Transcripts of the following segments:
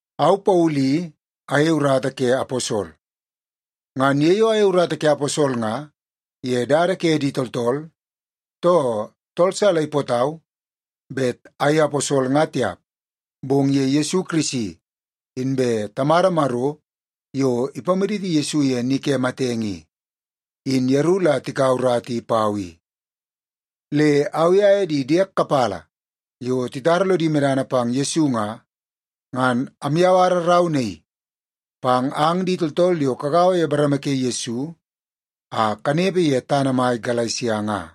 Au Paulu i ayei urata ke aposol. Ngan ye yo ayei urata ke aposol nga ye dada ke di tooltool, too tool sa la ipootau bet ayei aposol nga tiap, bong ye Yesu Kirisi inbe Tamada Maro yo ipamaditi Yesu ye ni ke matenge i, in yeru la tikaua urata i pau i. Le au i aye di diek kapala yo titara lodi medana pang Yesu nga, ngan amyawara rau naii pang ang di tooltool yo kagaua ye bareme ke Yesu a kanepe ye tana mai Galesia nga.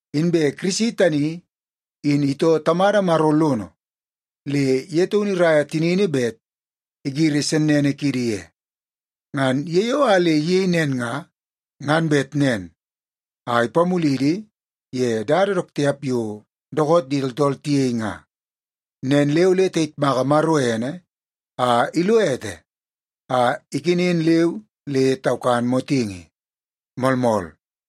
Inbe Kirisi tani in itoo Tamada Maro lono le ye taunu iraia tinini bet igiri sennene kiidi ye. Ngan ye yo a le iyei nen nga, ngan bet nen a ipamulidi ye dada dook tiap yo dookoot di tooltool tiyei nga. Nen le ole tayitmaka Maro ene a ilo ete a ikenen leu le taukan motingi. Moolmool.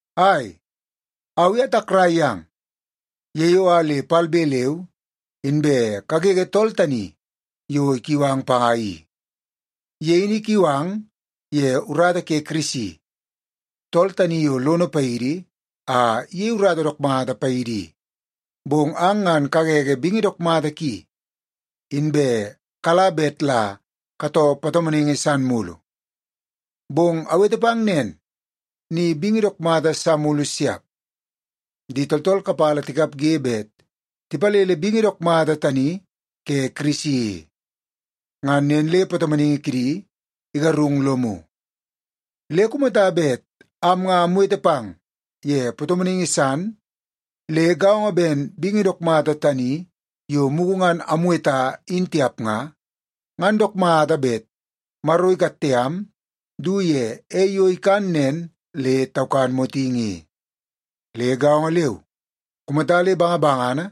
Ai, au i atakrai yang ye yo a le palbe leu inbe kagege tool tani yo ikiu ang panga i. Ye in ikiu ang ye urata ke Kirisi, tool tani yo lono paidi a iyei urata dook mata paidi i, bong ang ngan kagege bingi dook mata ki, inbe kala bet la katoo patomonaingi san mulu. Bong awete pang nen, ni bingi dook mata sa mulu siap. Di tooltool kapala tikapge bet tipalele bingi dook mata tani ke Kirisi i. Ngan nen le patomonaingi kidi igarung lomu. Le kumata bet am nga amwete pang ye patomonaingi san le gaongo ben bingi dook mata tani yo mugu ngan amweta in tiap nga, ngan dook mata bet Maro ikatte am du ye ei yo ikan nen le taukan motingi i. Le gaongo leu, kumata le bangabangana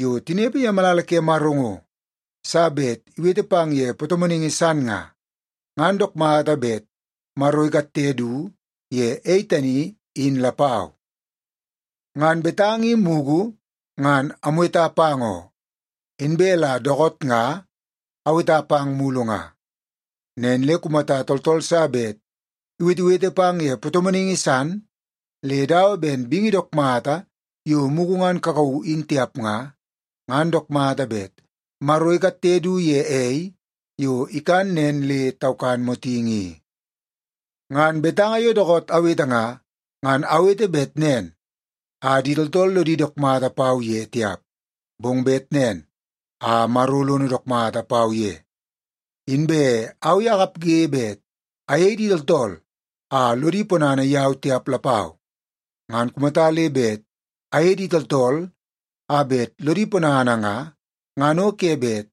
yo tinepe ye malala ke Maro ngo sa bet iwete pang ye patomonaingi san nga, ngan dook mata bet Maro ikatte du ye ei tani, in lapau. Ngan betanga i mugu ngan amweta pang oo, inbe la dookoot nga aweta pang mulu nga. Nen le kumata tooltool sa bet iwetewete pang ye patomonaingi san le dawa ben bingi dook mata yo mugu ngan kakauu in tiap nga, ngan dook mata bet Maro ikatte du ye ei yo ikan nen le taukan motingi i. Ngan betanga yo dookoot awete nga, ngan awete bet nen a di tooltool lodi dook mata pau ye tiap, bong bet nen a Maro lono dook mata pau ye. Inbe au i akapge bet ayei di tooltool a lodi ponana yau tiap lapau. Ngan kumata le bet ayei di tooltool a bet lodi ponana nga, ngan o ke bet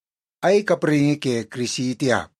ayei kapraingi ke Kirisi tiap.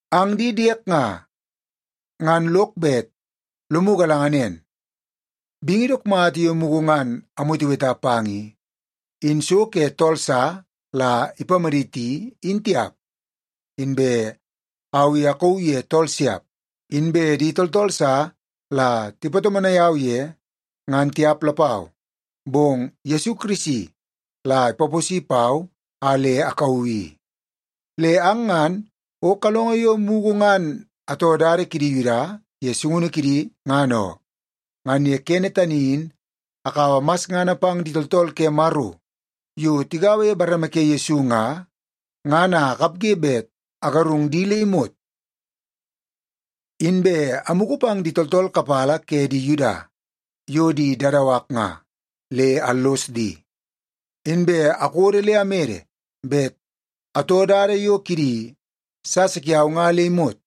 Ang di diek nga, ngan lok bet lomu galanga nen, bingi dook mata yo mugu ngan amweteweta pang i, in so ke tool sa la ipamaditi in tiap. Inbe au i akauu ye tool siap. Inbe di tooltool sa la tipatomonai au ye, ngan tiap lapau. Bong Yesu Kirisi la ipaposi pau a le akauu i. Le ang ngan o kalongo yo mugu ngan atoo dada kidi Yuda ye sungunu kidi, ngan oo. Ngan ye kene tani in akaua masngana pang di tooltool ke Maro yo tigaua ye bareme ke Yesu nga, ngan a akapge bet agarung di le imot. Inbe amugu pang di tooltool kapala ke di Yuda yo di dadawak nga, le allos di. Inbe akodo le amede bet atoo dada yo kidi sasa kiau nga le imot.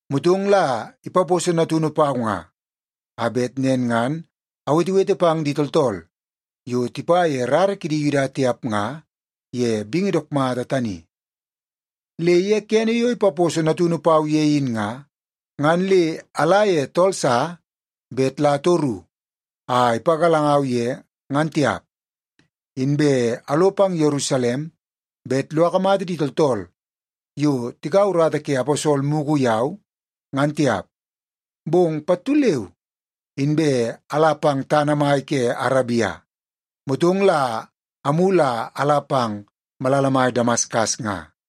motong la ipaposo Natunu pau nga, a bet nen ngan awetewete pang di tooltool yo tipa ye rara kidi Yuda tiap nga ye bingi dook mata tani. Le ye kene yo ipaposo Natunu pau ye in nga, ngan le ala ye tool sa bet la atoru a ipagalangau ye ngan tiap. Inbe alo pang Yerusalem bet lo akamata di tooltool yo tikaua urata ke aposol mugu yau, ngan tiap. Bong pattu leu inbe ala pang tana mai ke Arabia, motong la amulu a ala pang malala mai Damaskas nga.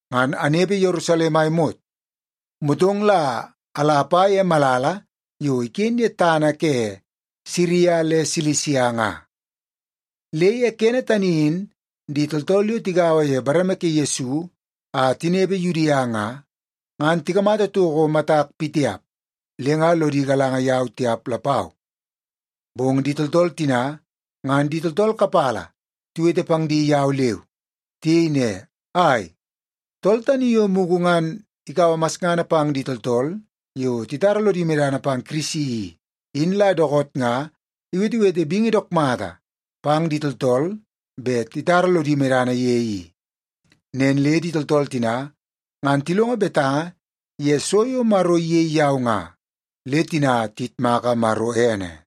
Ngan anepe Yerusalem a imot, motong la ala apa ye malala yo iken ye tana ke Siria le Silisia nga. Le ye kene tani in di tooltool yo tigaua ye bareme ke Yesu a tinepe Yudia nga, ngan tikamata toko matak pitiap le nga lodi galanga yau tiap lapau. Bong di tooltool tina ngan di tooltool kapala tiwete pang di yau leu. Tiyei ne, “Ai, tool tani yo mugu ngan ikaua masngana pang di tooltool yo titara lodi medana pang Kirisi i, in la dookoot nga iwetewete bingi dook mata pang di tooltool bet titara lodi medana ye i.” Nen le di tooltool tina, ngan tilongo betanga ye so yo Maro iyei yau nga, le tina tiyitmaka Maro ene.